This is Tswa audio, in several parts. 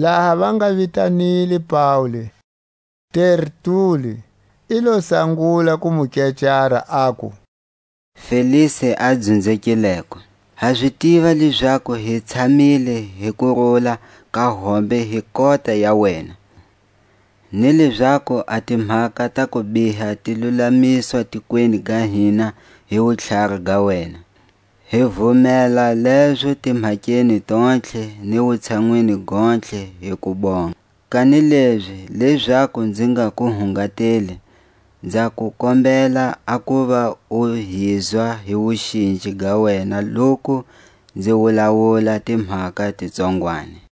Laha va nga vitanile Paule, Tertuli i lo sangula ku mu kecara, aku: Felisi a dzunzekileko, ha zi tiva lezaku hi tshamile hi kurula ka hombe hi kota ya wena, ni lezaku a timhaka ta kubiha ti lulamiswa tikweni ga hina hi wutlhari ga wena, hi vumela lezo timhakeni tontlhe ni wutshanwini gontlhe hi kubonga. Kanilezi lezaku nzi nga ku hungatela nza ku kombela a kuva u hizwa hi wuxinji ga wena loku nzi wulawula timhaka ti tsongwani.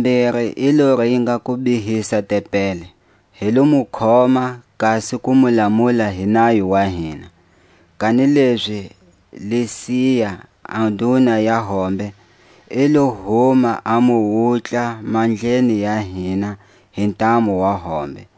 tlhatakumbiri i lo ringa ku bihisa tempeli. Hi lo mu khoma, kasi ku mu lamula hi nayo wa hina, kanilezi Lisia a nduna ya hombe, i lo huma a mu wutla mandleni ya hina hi ntamu wa hombe,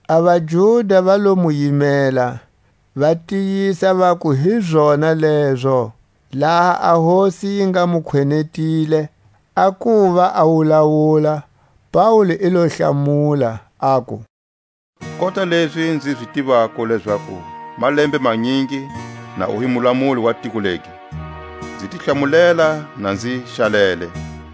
A vaJuda va lo mu yimela, va tiyisa vaku hi zona lezo. Laha a hosi yi nga mu khwenetile a kuva a wulawula, Faule i lo hlamula, aku: Kota lezi nzi zi tivako lezaku malembe manyingi na u hi mulamuli wa tiko legi, nzi ti hlamulela na nzi xalele.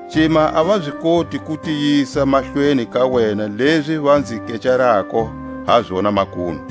Cima a va zi koti ku tiyisa mahlweni ka wena lezi va nzi kecarako ha zona makunu.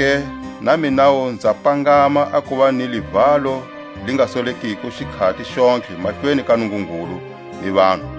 Hilezo-ke na minawu nza pangama a kuva ni livalo li nga solekiko xikhati xontlhe mahlweni ka Nungungulu ni vanhu.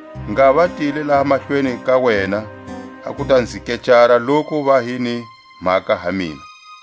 ngha va tile laha mahlweni ka wena, a ku ta nzi kecara loku va hi ni mhaka ha mina.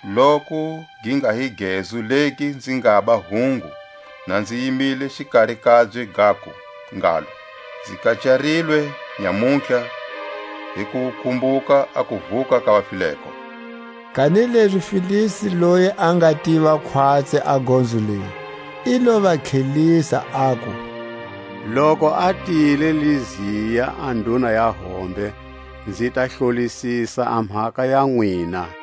loku gi nga hi gezu legi nzi ngaba hungu na nzi yimile xikari kabye gaku ngalo: Nzi kecarilwe nyamutlha hi kukumbuka a kuvuka ka vafileko. Kanilezi Felisi loyi a nga tiva khwatsi a gonzo leyi, i lo va tlhelisa, aku: Loku a tile Lisia a nduna ya hombe, nzi ta hlolisisa a mhaka ya nwina.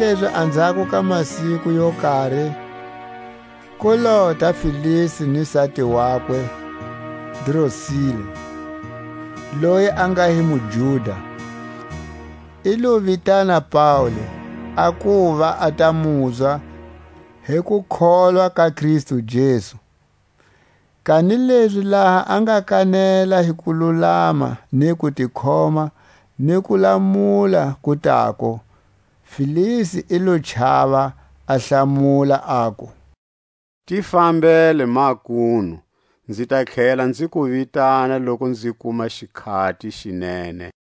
Kanilezi anzhako ka masiku yo kari, ku lota Felisi ni sati wakwe Drusila, loyi a nga hi muJuda, i lo vitana Paule, a kuva a ta muzwa hi kukholwa ka Kristu Jesu. Kanilezi laha a nga kanela hi kululama, ni kutikhoma, ni kulamula ku tako, Felisi i lo chava, a hlamula, aku: Ti fambele makunu, nzi ta tlhela nzi ku vitana loku nzi kuma xikhati xi nene.